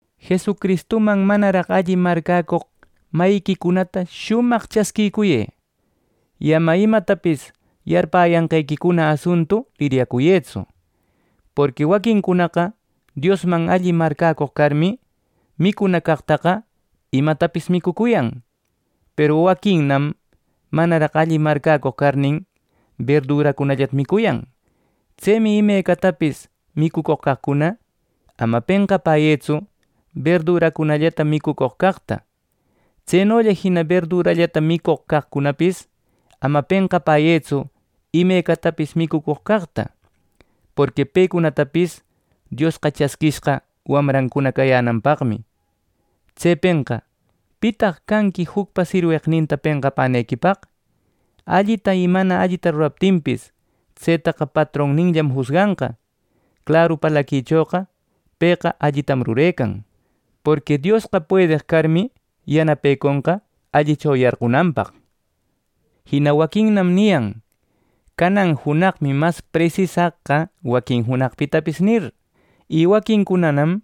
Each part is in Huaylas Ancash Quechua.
Jesucristuman manaraq alli marcäcoq mayiquicunata shumaq chasquiyë; y ama imatapis yarpäyanqequicuna asuntu liryacuyëtsu. Porqui waquincunaqa Diosman alli marcäcoq carmi, micuna caqtaqa imecatapis micuyan; peru waquinnam manaraq alleq marcäcoq carnin, berduracunallata micuyan. Tsemi imecatapis micucoq caqcuna, ama penqapäyëtsu berdurallata micucoq caqta. Tsenolla jina berdurallata micucoq caqcunapis ama penqapäyëtsu imecatapis micucoq caqta. Porqui pecunatapis Diosqa chasquishqa wamrancuna cayänanpaqmi. Tsepenqa, ¿pitaq canqui jucpa sirweqninta penqapänequipaq? Allita y mana allita ruraptinpis, tsetaqa patronninllam jusganqa. Claru parlaquichoqa pëqa allitam rurecan; porqui Diosqa puedeq carmi yanapeconqa allicho yarqunanpaq. Jina waquinnam niyan “Canan junaqmi mas presisaq waquin junaqpitapis” nir, y waquincunanam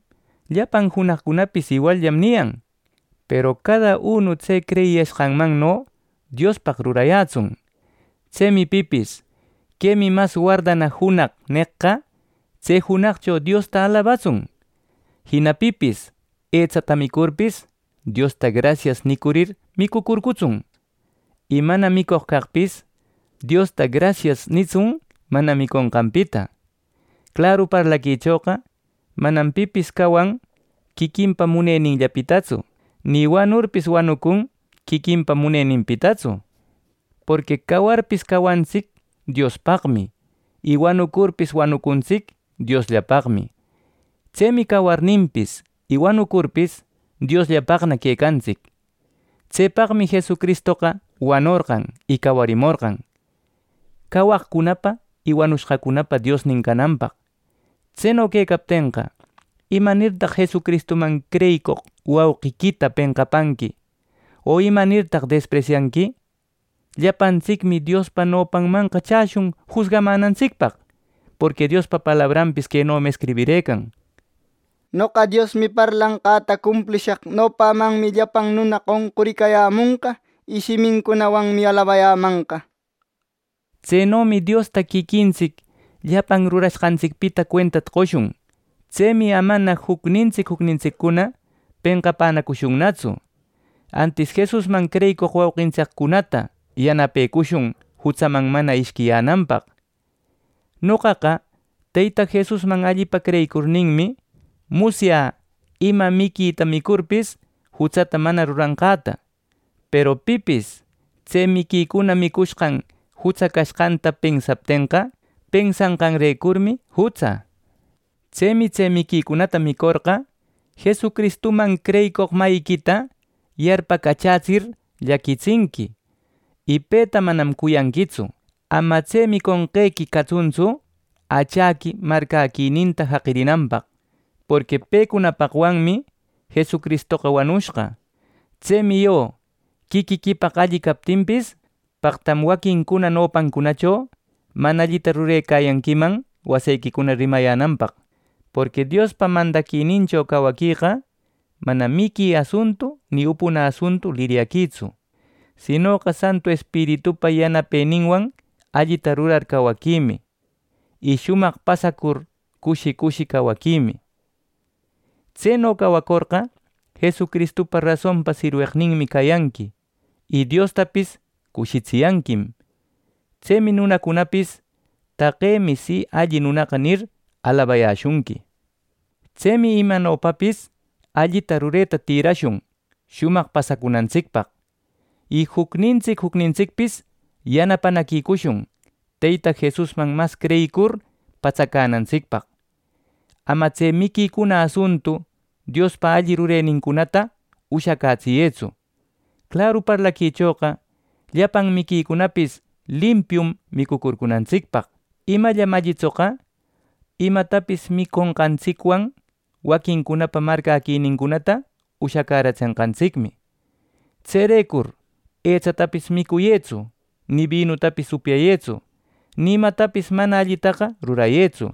“Llapan junaqcunapis iwalllam” niyan. Peru cada unu tse creyiyashqanmanno Diospaq rurayätsun. Tsemi pipis “Quemi mas wardana junaq” neqqa, tse junaqcho Diosta alabatsun. Jina pipis etsata micurpis, Diosta “Grasias” nicurir micucurcutsun. Y mana micoq caqpis Diosta “grasias” nitsun mana miconqanpita. Claru parlaquichoqa, manam pipis cawan quiquinpa muneninllapitatsu, ni wanurpis wanucun quiquinpa muneninpitatsu. Porqui cawarpis cawantsic Diospaqmi, y wanurpis wanucuntsic Diosllapaqmi. Tsemi cawarninpis y wanucurpis Diosllapaqna quecantsic. Tsepaqmi Jesucristoqa wanorqan y cawarimorqan, cawaqcunapa y wanushqacunapa Diosnin cananpaq. Tseno quecaptenqa, ¿Imanirtaq Jesucristuman creyicoq wauqiquita penqapanqui, o imanirtaq despresyanqui? Llapantsicmi Diospa nopanmanqa chäshun jusgamanantsicpaq. Porqui Diospa palabranpis quenomi escribirëcan: “Noqa Diosmi parlanqäta cumplishaq. Nopämanmi llapan nunacuna qonquricayämonqa y shimincunawanmi alabayämanqa” nir. Tsenomi Diosta quiquintsic llapan rurashqantsicpita cuentata qoshun. Tsemi amana jucnintsic jucnintsiccuna penqapänacushunnatsu; antis Jesusman creyicoq wauqintsiccunata yanapecushun jutsaman mana ishquiyänanpaq. Noqaqa Teyta Jesusman allipa creyicurninmi musyä ima miquita micurpis jutsata mana ruranqäta. Peru pipis tse miquicuna micushqan jutsa cashqanta pensaptenqa, pensanqanrecurmi jutsa. Tsemi tse miquicunata micorqa, Jesucristuman creyicoq mayiquita yarpacachätsir llaquitsinqui, y peta manam cuyanquitsu. Ama tse miconqequi catsuntsu achaqui marcäquininta jaqirinanpaq; porqui pecunapaqwanmi Jesucristoqa wanushqa. Tsemi yo quiquiquipaq alli captinpis, paqtam waquincuna nopancunacho mana allita rurecayanquiman wasequicuna rimayänanpaq. Porqui Diospa mandaquinincho cawaqueqa manam miqui asuntu ni upuna asuntu liryaquitsu. Sinoqa Santu Espiritupa yanapeninwan allita rurar cawaquimi y shumaq pasacur cushi cushi cawaquimi. Tseno cawacorqa, Jesucristupa rasonpa sirweqninmi cayanqui y Diostapis cushitsiyanquim. Tsemi nunacunapis “Taqemi si alli nunaqa” nir, alabariyäshunqui. Tsemi imanopapis allita rureta tïrashun shumaq pasacunantsicpaq. Y jucnintsic jucnintsicpis yanapanaquicushun Teyta Jesusman mas creyicur patsacänantsicpaq. Ama tse miquicuna asuntu Diospa alli rurenincunata ushacätsiyëtsu. Claru parlaquichoqa llapan miquicunapis limpium micucunantsicpaq, imallam allitsoqa, imatapis miconqantsicwan waquincunapa marcäquinincunata ushacäratsenqantsicmi. Tserecur etsatapis micuyëtsu, ni binutapis upyayëtsu, ni imatapis mana allitaqa rurayëtsu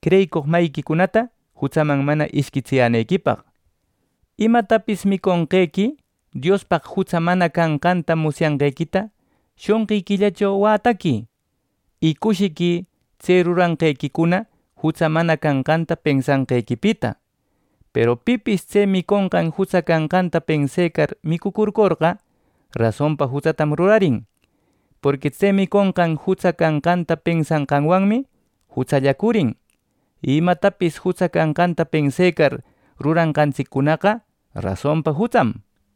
creyicoq mayiquicunata jutsaman mana ishquitsiyänequipaq. Imatapis miconqequi Diospaq jutsa mana canqanta musyanqequita shonqiquillacho wätaquï. ¡Y cushiquï tse ruranqequicuna jutsa mana canqanta pensanqequipita! Peru pipis tse miconqan jutsa canqanta pensecar micucurcorqa, rasonpa jutsatam rurarin. Porqui tse miconqan jutsa canqanta pensanqanwanmi jutsallacurin y imatapis jutsa canqanta pensecar rurashqantsiccunaqa, rasonpa jutsam.